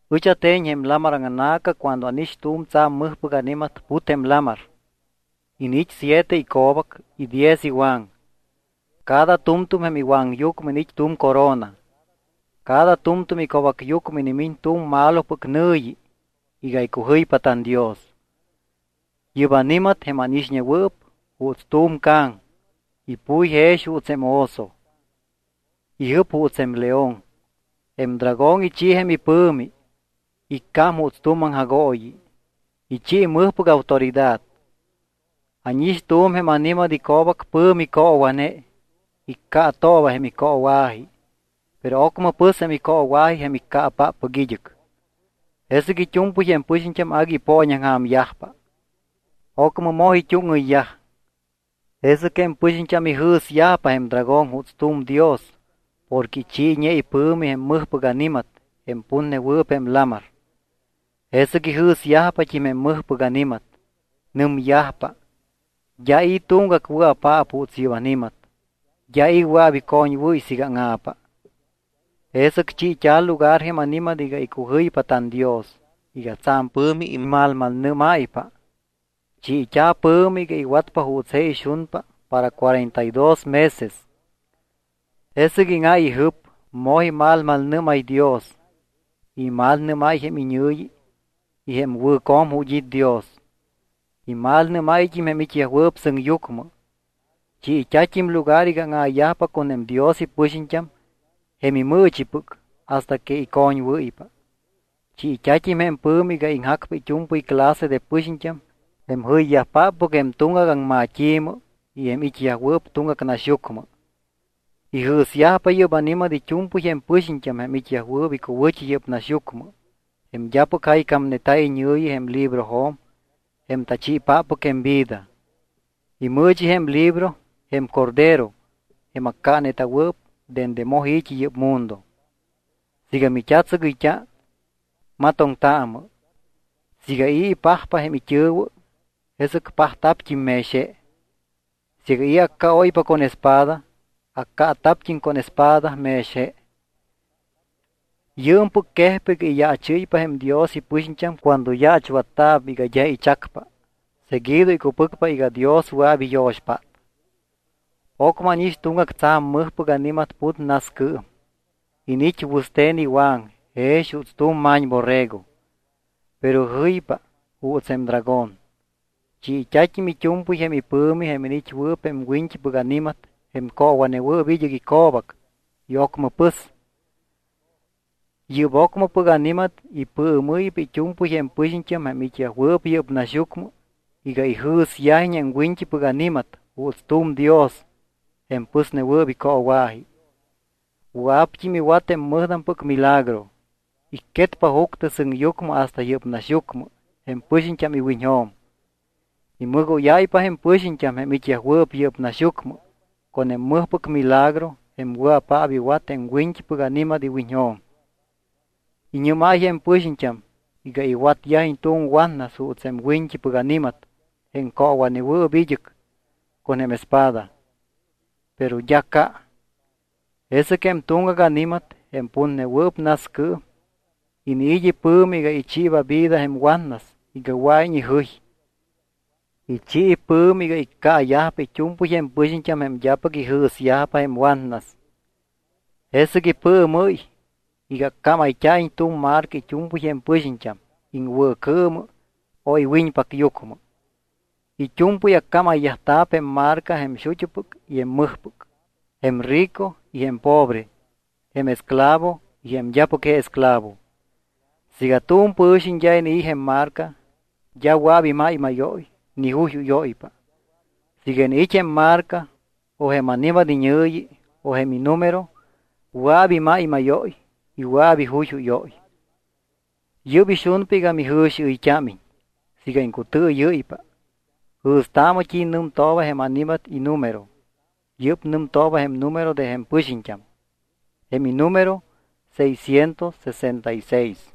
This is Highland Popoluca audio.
Ɨch ate̱ñ jém lamar aŋna̱ca cuando ánix tu̱m tsa̱m mɨjpɨc ani̱mat put jém lamar. Iniit́ siete ico̱bac y diez iwaŋ. Cada tu̱mtu̱m jém iwaŋyucmɨ iniit́ tu̱m corona. Cada tu̱mtu̱m ico̱bacyucmɨ inimiñ tu̱m malopɨc nɨ̱yi iga icujɨypa tanDios. Yɨ́p ani̱mat, jém ánixñewɨɨp, juuts tu̱m ca̱ŋ. Ipuy jex juuts jém oso. Ijɨp juuts jém león. Jém dragón ichi jém ipɨ̱mi, iccám juuts tu̱m aŋjagooyi, ichi mɨjpɨc autoridad. Ánix tu̱m jém ani̱mat ico̱bac pɨ̱mi coowa̱ne. Iccaatooba jém icoowa̱ji, pero ocmɨ pɨs jém icoowa̱ji jém iccaapáppɨc id́ɨc. Jesɨc it́u̱mpɨy jém pɨxiñt́am agui ipooñaŋja̱myajpa, ocmɨ moj it́úŋɨyyaj. Jesɨc jém pɨxiñt́am ijɨ̱syajpa jém dragón juuts tu̱m dios porque ichiiñe ipɨ̱mi jém mɨjpɨc ani̱mat jém putnewɨɨp jém lamar. Jesɨc ijɨ̱syajpat́im jém mɨjpɨc ani̱mat. Nɨmyajpa: —D́a i̱ tuŋgac wɨa̱paap juuts yɨ́p ani̱mat. D́a i̱ wɨa̱p icoñwɨ́y siiga áŋa̱pa. Jesɨc chiit́a̱ lugar jém ani̱mat iga icujɨypa tanDios iga tsa̱m pɨ̱mi imalmalnɨ́máypa. Chiit́a̱ pɨ̱mi iga iwatpa juuts je ixunpa para cuarenta y dos meses. Jesɨc íŋáy ijɨp, moj imalmalnɨ́máy Dios y imalnɨ́máy jém iñɨ̱yi y jém wɨ̱co̱m ju̱t́ it́ Dios. Imalnɨ́máyt́im jém it́yajwɨɨp sɨŋyucmɨ. Chiit́a̱t́im lugar iga áŋa̱yajpa con jém Dios ipɨxiñt́am jém imɨɨchipɨc hasta que icoñwɨ́ypa. Chiit́a̱t́im jém pɨ̱mi iga iŋjacpa it́u̱mpɨy clase de pɨxiñt́am, jém jɨyyajpáppɨc jém tuŋgac aŋmat́i̱mɨ y jém it́yajwɨɨp tuŋgac naxyucmɨ. Ijɨ̱syajpa yɨ́p ani̱mat it́u̱mpɨy jém pɨxiñt́am jém it́yajwɨɨp icuwɨ̱t́i yɨ́p naxyucmɨ, jém d́apɨc jaycámneta̱ iñɨ̱yi jém librojo̱m jém tachiipáppɨc jém vida. Imɨɨchi jém libro jém Cordero jém accaaneta̱wɨɨp dende moj i̱t́i yɨ́p mundo. Siiga mit́atsɨgɨyt́a, matoŋtaamɨ. Siiga i̱ ipajpa jém it́ɨ̱wɨ, jesɨc pajta̱pt́im mex je. Siiga i̱ accaóypa con espada, accaata̱pt́im con espada mex je. Yɨɨmpɨc quejpa iga iyaachɨ́ypa jém Dios ipɨxiñt́am cuando yaachwatta̱p iga d́a ichacpa, seguido icupɨcpa iga Dios wɨa̱p iyo̱xpát. Ocmɨ ánix tuŋgac tsa̱m mɨjpɨc ani̱mat put nascɨɨm. Iniit́ wɨste̱n iwaŋ jex juuts tu̱m ma̱ñborrego, pero jɨypa juuts jém dragón. Chiit́a̱t́im it́u̱mpɨy jém ipɨ̱mi jém iniit́wɨɨp jém wiñt́ipɨc ani̱mat jém coowa̱newɨɨp id́ɨc ico̱bac y ocmɨ pɨs. Yɨ́p ocmɨpɨc ani̱mat ipɨɨmɨ́ypa it́u̱mpɨy jém pɨxiñt́am jém it́yajwɨɨp yɨ́p naxyucmɨ iga ijɨ̱syajiñ jém wiñt́ipɨc ani̱mat juuts tu̱m dios jém pɨsnewɨɨp icoowa̱ji. Wɨa̱pt́im iwat jém mɨjtampɨc milagro. Icquetpa juctɨ sɨŋyucmɨ hasta yɨ́p naxyucmɨ jém pɨxiñt́am iwiñjo̱m. Imɨgóyáypa jém pɨxiñt́am jém it́yajwɨɨp yɨ́p naxyucmɨ con jém mɨjpɨc milagro jém wɨa̱paap iwat jém wiñt́ipɨc ani̱mat iwiñjo̱m. Iñɨ́máy jém pɨxiñt́am iga iwatyajiñ tu̱m watnas juuts jém wiñt́ipɨc ani̱mat jém coowa̱newɨɨp id́ɨc con jém espada, pero d́a ca. Jesɨc jém tuŋgac ani̱mat, jém putnewɨɨp nascɨɨm, iniit́ ipɨ̱mi iga ichiiba ivida jém watnas iga wɨa̱iñ ijɨy. Ichi ipɨ̱mi iga iccaayajpa it́u̱mpɨy jém pɨxiñt́am jém d́apɨc ijɨ̱syajpa jém watnas. Jesɨc ipɨɨmɨ́y iga accámayt́a̱iñ tu̱m marca it́u̱mpɨy jém pɨxiñt́am iŋwɨ̱cɨɨmɨ o iwiñpacyucmɨ. It́u̱mpɨy accámayyajta̱p jém marca jém xut́upɨc y jém mɨjpɨc, jém rico y jém pobre, jém esclavo y jém d́apɨc je esclavo. Siiga tu̱m pɨ̱xiñ d́a inii̱ jém marca, d́a wɨa̱p imáymáyóy ni juyjúyóypa. Siiga iniit́ jém marca o jém ani̱mat iñɨ̱yi o jém inumero wɨa̱p imáymáyóy y wɨa̱p ijuyjúyóy. Yɨ́p ixunpa iga mijɨ̱xiɨyt́ámiñ. Siiga iŋcutɨɨyɨ́ypa, jɨ̱staamɨ t́i nɨmtooba jém ani̱mat inumero. Yɨ́p nɨmtooba jém numero de jém pɨxiñt́am. Jém inumero seiscientos sesenta y seis.